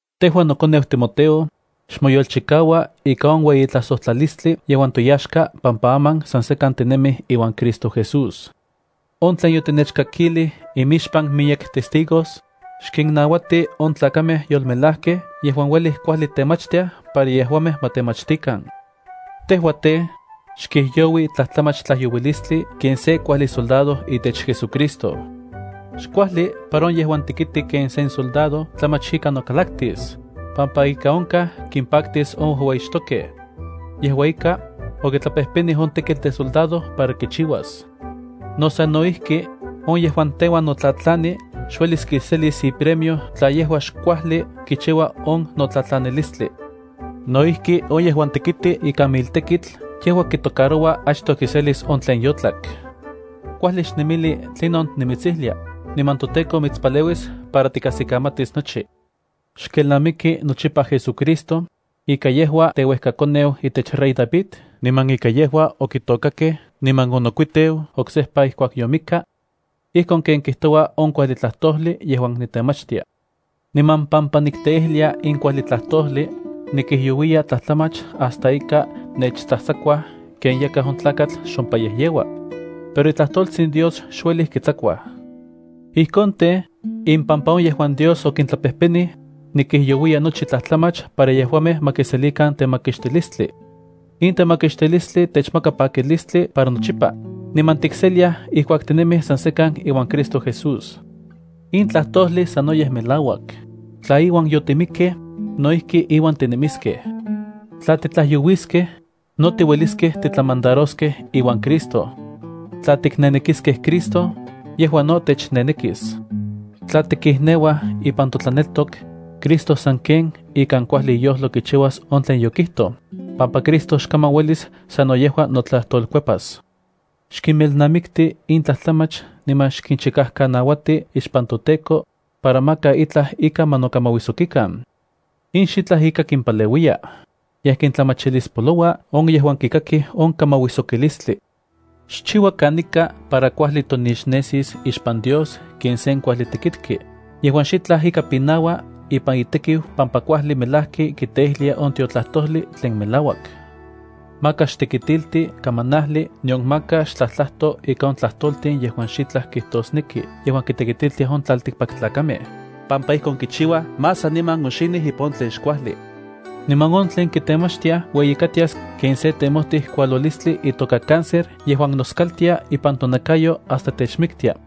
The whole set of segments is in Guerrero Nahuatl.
Tejua nokoneu Timoteo, xmoyolchikaua ika on ueyitlajsojtlalistli yejuan toyaxka pampa aman san sekan tinemij iuan Cristo Jesús. On tlen yotinechkakilij imixpan miyek testigos, xkinnauati on tlakamej yolmelajkej yejuan uelij kuajli temachtiaj para yejuamej ma temachtikan. Tejua tej, xkijyoui tlajtlamach tlajyouilistli ken se kuajli soldado itech JesuCristo. Xkuajli para on yejuan tekiti ken sen soldado tlamach ika nokalaktis, pampa ika onkaj kimpaktis on uejueyixtokej. Yejua ika, okitlapejpenij on tekitl de soldado para kichiuas. No sano ijki, on yejuan teuan notlatlani xuelis kiselis ipremio tla yejua xkuajli kichiua on notlatlanilistli. No ijki on yejuan tekiti ikan miltekitl, yejua kitocaroua achtoj kiselis on tlen yotlak. Kuajli xnemili tlinon nimitsijlia, niman toTEKO mitspaleuis para tikajsikamatis nochi. Xkelnamiki nochipa JesuCristo, ika yejua teuejkakoneu itech rey David niman ika yejua okitôkakej niman onokuiteu oksejpa ijkuak yomikka. Ijkon ken kijtoua on kuajli tlajtojli yejuan nitemachtia. Niman pampa nikteijlia in kuajli tlajtojli, nikijyouiya tlajtlamach hasta ika nechtsajtsakuaj ken yakaj on tlakatl xompayejyeua. Pero itlajtoltsin Dios xuelij kitsakuaj. Ijkon tej, impampa on yejuan Dios okintlapejpenij, nikijyouiya nochi tlajtlamach para yejuamej ma kiselikan temakixtilistli. In temakixtilistli techmaka pakilistli para nochipa, niman tikseliaj ijkuak tinemij san sekan iuan Cristo Jesús. In tlajtojli sanoyej melauak: Tla iuan yotimikkej, no ijki iuan tinemiskej. Tla titlajyouiskej, no tiueliskej titlamandaroskej iuan Cristo. Tla tiknenekiskej Cristo, yejua no technenekis. Tla tikijneuaj ipan totlaneltok, Cristo sanken ikan kuajli iyojlo kichiuas on tlen yokijtoj, pampa Cristo xkaman uelis sano yejua notlajtolkuepas. Xkinmelnamikti in tlajtlamach niman xkinchikajkanauati ixpan toTEKO, para maka itlaj ika ma nokamauijsokikan. In xitlaj ika kimpaleuiya, yej kintlamachilispoloua on yejuan kikakij on kamauijsokilistli. Xchiua kanika para kuajli tonixnesis ixpan Dios ken sen kuajli tekitki, yejuan xitlaj ika pinaua ipan itekiu pampa kuajli melajki kiteijlia in tlajtojli tlen melauak. Maka xtekitilti kamanajli nion maka xtlajtlajto ika on tlajtoltin yejuan xitlaj kijtosneki yejuan kitekitiltiaj on tlaltikpaktlakamej, pampa ijkon kichiuaj más saniman onxinij ipan on tlen xkuajli. Niman on tlen kitemachtiaj ueyikatias ken se temojtij kualolistli itoka cáncer yejuan noskaltia ipan tonakayo hasta techmiktia.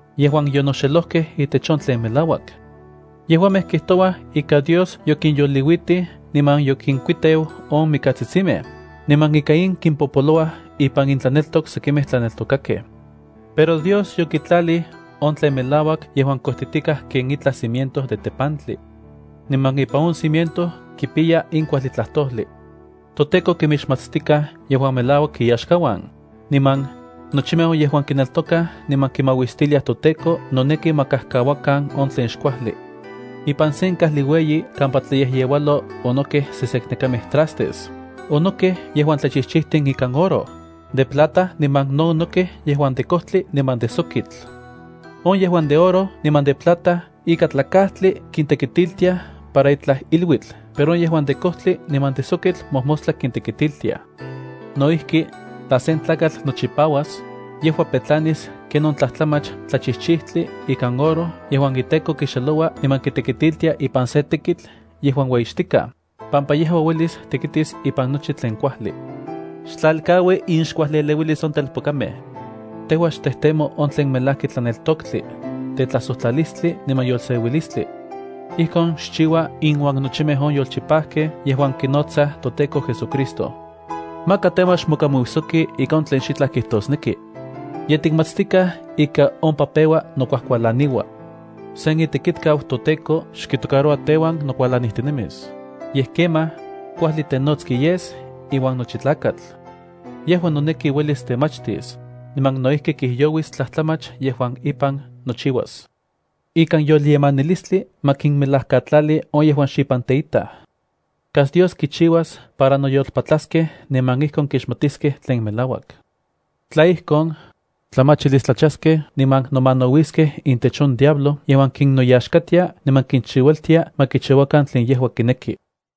yejuan yonoxelojkej itech on tlen melauak. Yejuamej kijtouaj ika Dios yokinyoliuitij niman yokinkuiteu on mikatsitsimej, niman ika in kimpopolouaj ipan intlaneltok sekimej tlaneltokakej. Pero Dios yokitlalij on tlen melauak yejuan kojtitikaj ken itlaj cimiento de tepantli. Niman ipan on cimiento kipiya in kuajli tlajtojli: “ToTEKO kimixmatstikaj yejuan melauak iyaxkauan”, niman “Nochimej on yejuan kineltokaj niman kimauistiliaj toTEKO noneki ma kajkauakan on tlen xkuajli.” Ipan sen kajli ueyi kampa tlayejyeualo onokej seseknekamej trastes: onokej yejuan tlachijchijtin ikan oro, de plata niman no onokej yejuan de kojtli niman de sokitl. On yejuan de oro niman de plata ika tlakajtli kintekitiltiaj para itlaj iluitl pero on yejuan de kojtli niman de sokitl mojmostla kitekitiltiaj. No ijki, tla sen tlakatl nochipauas, yejua petlanis ken on tlajtlamach tlachijchijtli ikan oro yejuan iteko kixeloua niman kitekitiltia ipan se tekitl yejuan ueyixtikaj, pampa yejua uelis tekitis ipan nochi tlen kuajli. Xtlalkaui inxkuajlieleuilis on telpokamej. Tejua xtejtemo on tlen melajki, tlaneltoktli, tetlajsojtlalistli niman yolseuilistli. Ijkon xchiua inuan nochimej on yolchipajkej yejuan kinotsaj toTEKO JesuCristo. Maka teuan xkamauijsoki ika on tlen xitlaj kijtosnekij. Ye tikmatstikaj ika ompa peua nokuajkualaniua. Sen itekitkau toTEKO xkitocaroua teuan nokualanijtinemis, yej kemaj, kuajli tenotski yes iuan nochi tlakatl. Yejua noneki uelis temachtis, niman no ijki kijyouis tlajtlamach yejuan ipan nochiuas. Ikan yolyemanilistli ma kinmelajkatlali on yejuan xipanteitaj. Kas Dios kichiuas para noyolpatlaskej niman ijkon kixmatiskej tlen melauak. Tla ijkon, tlamachilistlachaskej niman nomanauiskej itech on diablo yejuan kinnoyaxkatia niman kinchiualtia ma kichiuakan tlen yejua kineki.